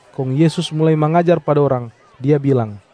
Kong Yesus mulai mangajar pa dorang, Dia bilang,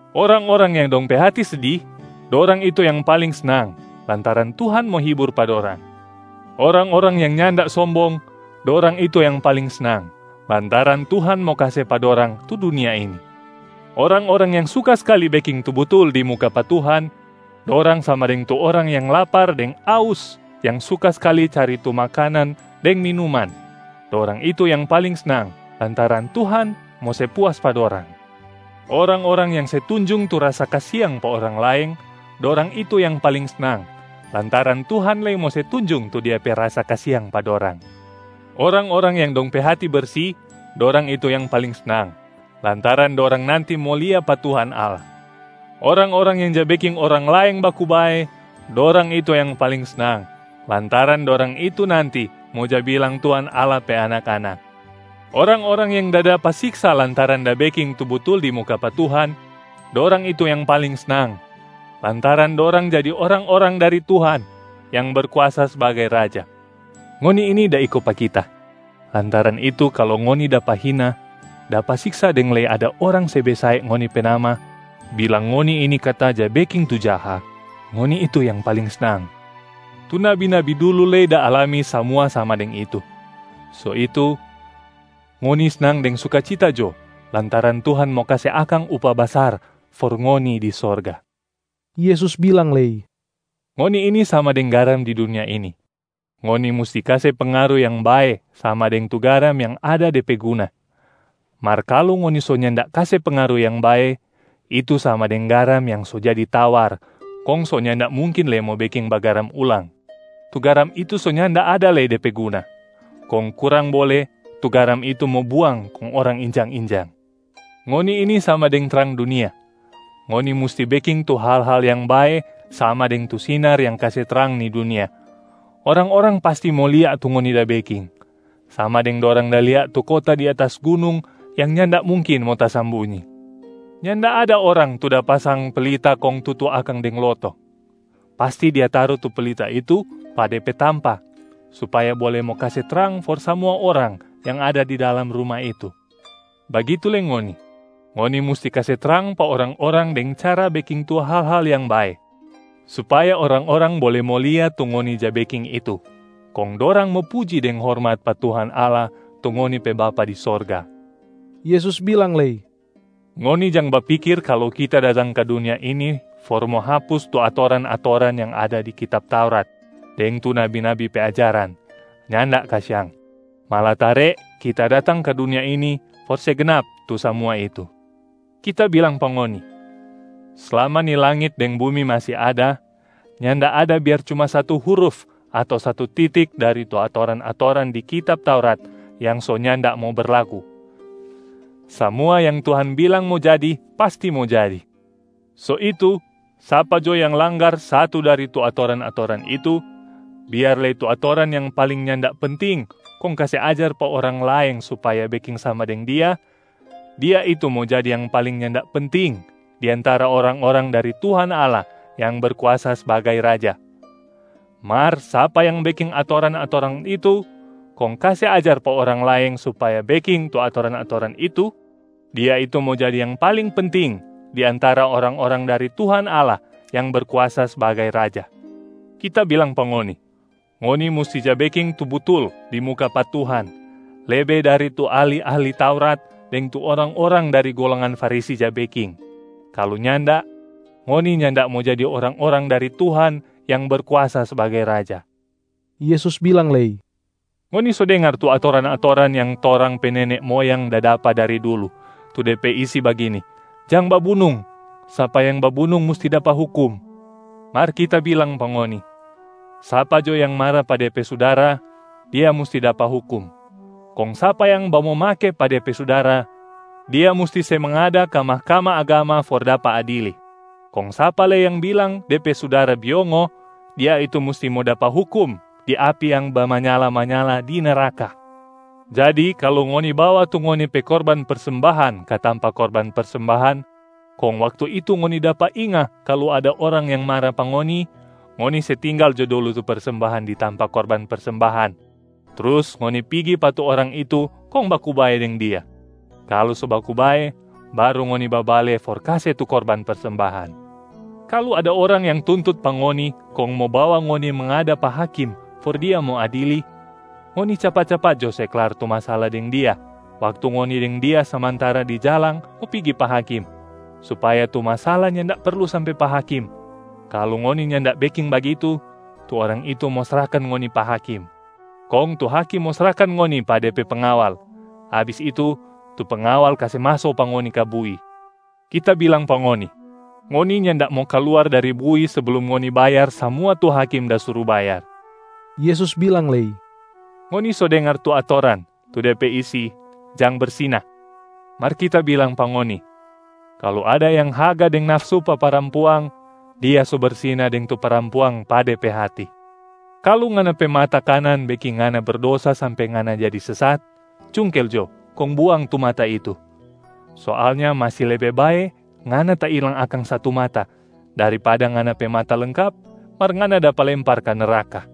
Orang-orang yang dong pe hati sedi, dorang itu yang paling snang, lantaran Tuhan mo hibur pa dorang. Orang-orang yang nyanda sombong, dorang itu yang paling snang, lantaran Tuhan mo kase pa dorang tu dunia ini. Orang-orang yang suka skali beking tu butul di muka pa Tuhan, dorang sama deng tu orang yang lapar deng aus yang suka skali cari tu makanan deng minuman, dorang itu yang paling snang, lantaran Tuhan mo se puas pa dorang. Orang-orang yang se tunjung tu rasa kasiang pa orang laeng, dorang itu yang paling snang, lantaran Tuhan lei mo se tunjung tu Dia pe rasa kasiang pa dorang. Orang-orang yang dong pe hati bersi, dorang itu yang paling snang, lantaran dorang nanti mo lia pa Tuhan Allah. Orang-orang yang ja beking orang laeng baku bae, dorang itu yang paling snang, lantaran dorang itu nanti mo ja bilang Tuhan Allah pe anak-anak. Orang-orang yang da dapa siksa lantaran da beking tu butul di muka pa Tuhan, dorang itu yang paling snang, lantaran dorang jadi orang-orang dari Tuhan yang Berkuasa sbagai Raja. Ngoni ini da iko pa Kita, lantaran itu kalu ngoni dapa hina, dapa siksa deng lei ada orang se besae ngoni pe nama bilang ngoni ini kata ja beking tu jaha, ngoni itu yang paling snang. Tu nabi-nabi dulu lei da alami samua sama deng itu. So itu, ngoni snang deng sukacita jo lantaran Tuhan mo kase akang upah basar for ngoni di sorga.” Yesus bilang lei, “Ngoni ini sama deng garam di dunia ini, ngoni musti kase pengaru yang bae sama deng tu garam yang ada de pe guna. Mar kalu ngoni so nyanda kase pengaru yang bae, itu sama deng garam yang so jadi tawar kong so nyanda mungkin lei mo beking bagaram ulang. Tu garam itu so nyanda ada lei de pe guna, kong kurang bole tu garam itu mo buang kong orang injang-injang. Ngoni ini sama deng trang dunia, ngoni musti beking tu hal-hal yang bae sama deng tu sinar yang kase trang ni dunia. Orang-orang pasti mo lia tu ngoni da beking, sama deng dorang da lia tu kota di atas gunung yang nyanda mungkin mo tasambunyi. Nyanda ada orang tu da pasang pelita kong tutu akang deng loto. Pasti dia taru tu pelita itu pa de pe tampa supaya bole mo kase trang for samua orang yang ada di dalam ruma itu. Bagitu lei ngoni, ngoni musti kase trang pa orang-orang deng cara beking tu hal-hal yang bae supaya orang-orang bole mo lia tu ngoni ja beking itu, kong dorang mo puji deng hormat pa Tuhan Allah tu ngoni pe Bapa di sorga.” Yesus bilang lei, “Ngoni jang bapikir kalu Kita datang ka dunia ini for mo hapus tu atoran-atoran yang ada di kitab Taurat deng tu nabi-nabi pe ajaran, nyanda kasiang. Malatare Kita datang ka dunia ini for se gnap tu samua itu. Kita bilang pa ngoni, slama ni langit deng bumi masi ada, nyanda ada biar cuma satu huruf ato satu titik dari tu atoran-atoran di kitab Taurat yang so nyanda mo berlaku, samua yang Tuhan bilang mo jadi pasti mo jadi. So itu, sapa jo yang langgar satu dari tu atoran-atoran itu, biar lei tu atoran yang paling nyanda penting kong kase ajar pa orang laeng supaya beking sama deng dia, dia itu mo jadi yang paling nyanda penting di antara orang-orang dari Tuhan Allah yang berkuasa sbagai Raja. Mar sapa yang beking atoran-atoran itu kong kase ajar pa orang laeng supaya beking tu atoran-atoran itu, dia itu mo jadi yang paling penting di antara orang-orang dari Tuhan Allah yang Berkuasa sbagai Raja. Kita bilang pa ngoni, ngoni musti ja beking tu butul di muka pa Tuhan lebe dari tu ahli-ahli Taurat deng tu orang-orang dari golongan Farisi ja beking, kalu nyanda, ngoni nyanda mo jadi orang-orang dari Tuhan yang Berkuasa sbagai Raja.” Yesus bilang lei, “Ngoni so dengar tu atoran-atoran yang torang pe nene moyang da dapa dari dulu, tu de pe isi bagini, ‘Jang babunung. Sapa yang babunung musti dapa hukum.’ Mar Kita bilang pa ngoni, sapa jo yang mara pa dia pe sudara, dia musti dapa hukum. Kong sapa yang bamomake pa dia pe sudara, dia musti se mangada ka Mahkamah Agama for dapa adili. Kong sapa lei yang bilang de pe sudara biongo, dia itu musti mo dapa hukum di api yang bamanyala-manyala di neraka. Jadi kalu ngoni bawa tu ngoni pe korban persembahan ka tampa korban persembahan, kong waktu itu ngoni dapa inga kalu ada orang yang mara pa ngoni, ngoni se tinggal jo dulu tu persembahan di tampa korban persembahan, trus ngoni pigi pa tu orang itu kong baku bae deng dia. Kalu so baku bae, baru ngoni babale for kase tu korban persembahan. Kalu ada orang yang tuntut pa ngoni kong mo bawa ngoni mangada pa hakim for dia mo adili, ngoni capat-capat jo se klar tu masala deng dia waktu ngoni deng dia samantara di jalang mo pigi pa hakim, supaya tu masala nyanda perlu sampe pa hakim. Kalu ngoni nyanda beking bagitu, tu orang itu mo srahkan ngoni pa hakim, kong tu hakim mo srahkan ngoni pa de pe pengawal. Abis itu, tu pengawal kase maso pa ngoni ka bui. Kita bilang pa ngoni, ngoni nyanda mo kaluar dari bui seblum ngoni bayar samua tu hakim da suru bayar.” Yesus bilang lei, “Ngoni so dengar tu atoran, tu de pe isi, ‘Jang bersina’. Mar Kita bilang pa ngoni, kalu ada yang haga deng nafsu pa parampuang, dia so bersina deng tu parampuang pa de pe hati. Kalu ngana pe mata kanan beking ngana berdosa sampe ngana jadi sesat, cungkel jo kong buang tu mata itu! Soalnya masi lebe bae ngana tailang akang satu mata, daripada ngana pe mata lengkap mar ngana dapa lempar ka neraka.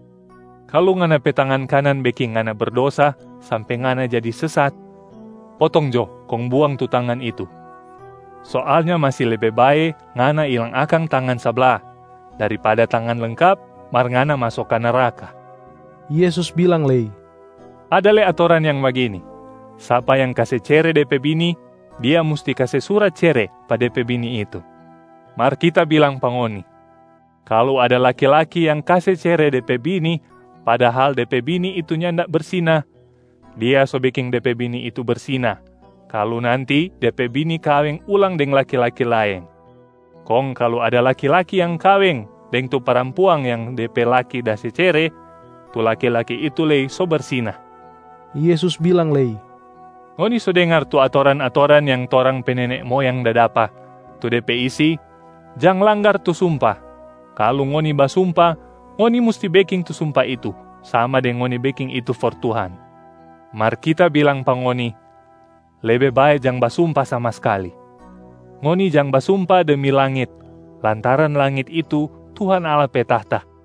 Kalu ngana pe tangan kanan beking ngana berdosa sampe ngana jadi sesat, potong jo kong buang tu tangan itu! Soalnya masi lebe bae ngana ilang akang tangan sabla, daripada tangan lengkap mar ngana maso ka neraka.” Yesus bilang lei, “Ada lei atoran yang bagini, ‘Sapa yang kase cere de pe bini, dia musti kase surat cere pa de pe bini itu.’ Mar Kita bilang pa ngoni, kalu ada laki-laki yang kase cere de pe bini padahal de pe bini itu nyanda bersina, dia so beking de pe bini itu bersina kalu nanti de pe bini kaweng ulang deng laki-laki laeng. Kong kalu ada laki-laki yang kaweng deng tu parampuang yang de pe laki da se cere, tu laki-laki itu lei so bersina.” Yesus bilang lei, “Ngoni so dengar tu atoran-atoran yang torang pe nene moyang da dapa, tu de pe isi, ‘Jang langgar tu sumpa. Kalu ngoni basumpa, ngoni musti beking tu sumpa itu sama deng ngoni beking itu for Tuhan.’ Mar Kita bilang pa ngoni, lebe bae jang basumpa sama skali. Ngoni jang basumpa demi langit, lantaran langit itu Tuhan Allah pe tahta.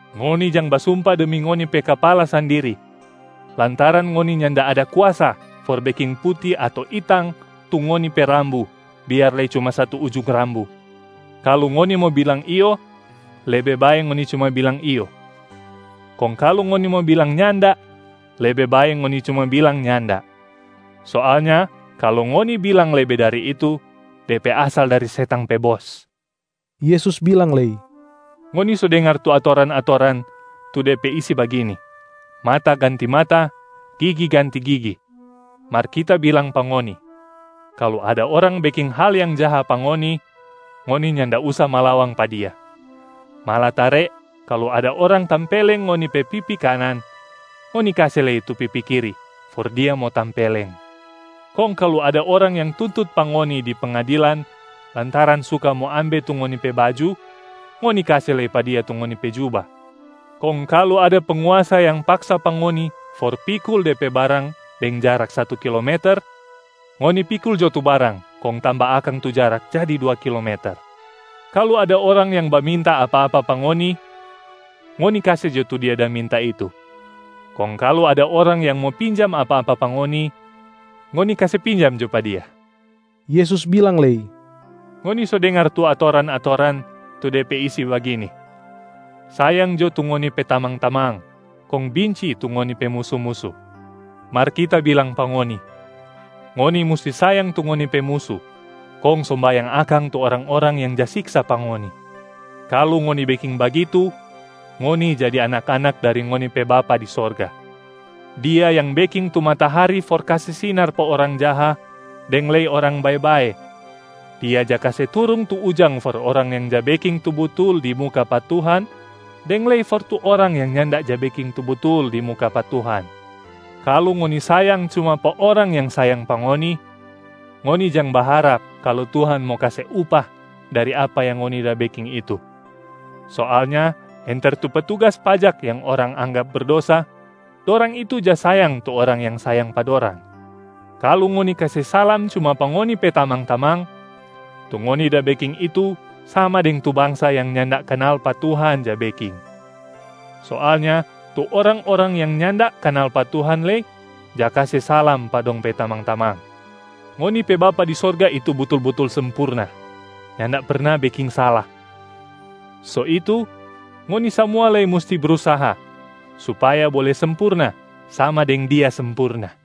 Ngoni jang basumpa demi ngoni pe kapala sandiri, lantaran ngoni nyanda ada kuasa for beking puti ato itang tu ngoni pe rambu biar lei cuma satu ujung rambu. Kalu ngoni mo bilang ‘iyo’, lebe bae ngoni cuma bilang ‘iyo’. Kong kalu ngoni mo bilang ‘nyanda’, lebe bae ngoni cuma bilang ‘nyanda’. Soalnya kalu ngoni bilang lebe dari itu, de pe asal dari setang pe bos.” Yesus bilang lei, “Ngoni so dengar tu atoran-atoran, tu de pe isi bagini, ‘Mata ganti mata, gigi ganti gigi.’ Mar Kita bilang pa ngoni, kalu ada orang beking hal yang jaha pa ngoni, ngoni nyanda usa malawang pa dia. Malatare kalu ada orang tampeleng ngoni pe pipi kanan, ngoni kase lei tu pipi kiri for dia mo tampeleng. Kong kalu ada orang yang tuntut pa ngoni di pengadilan lantaran suka mo ambe tu ngoni pe baju, ngoni kase lei pa dia tu ngoni pe juba. Kong kalu ada penguasa yang paksa pa ngoni for pikul de pe barang deng jarak satu kilometer, ngoni pikul jo tu barang kong tamba akang tu jarak jadi dua kilometer. Kalu ada orang yang baminta apa-apa pa ngoni, ngoni kase jo tu dia da minta itu. Kong kalu ada orang yang mo pinjam apa-apa pa ngoni, ngoni kase pinjam jo pa dia.” Yesus bilang lei, “Ngoni so dengar tu atoran-atoran, tu de pe isi bagini, ‘Sayang jo tu ngoni pe tamang-tamang, kong binci tu ngoni pe musu-musu.’ Mar Kita bilang pa ngoni, ngoni musti sayang tu ngoni pe musu kong sombayang akang tu orang-orang yang ja siksa pa ngoni. Kalu ngoni beking bagitu, ngoni jadi anak-anak dari ngoni pe Bapa di sorga. Dia yang beking tu matahari for kase sinar pa orang jaha deng lei orang bae-bae. Dia ja kase turung tu ujang for orang yang ja beking tu butul di muka pa Tuhan deng lei for tu orang yang nyanda ja beking tu butul di muka pa Tuhan. Kalu ngoni sayang cuma pa orang yang sayang pa ngoni, ngoni jang baharap kalu Tuhan mo kase upah dari apa yang ngoni da beking itu. Soalnya enter tu petugas pajak yang orang anggap berdosa, dorang itu ja sayang tu orang yang sayang pa dorang. Kalu ngoni kase salam cuma pa ngoni pe tamang-tamang, tu ngoni da beking itu sama deng tu bangsa yang nyanda kanal pa Tuhan ja beking. Soalnya tu orang-orang yang nyanda kanal pa Tuhan lei ja kase salam pa dong pe tamang-tamang. Ngoni pe Bapa di sorga itu butul-butul sempurna, nyanda perna beking sala. So itu ngoni samua lei musti brusaha supaya bole sempurna sama deng Dia sempurna.”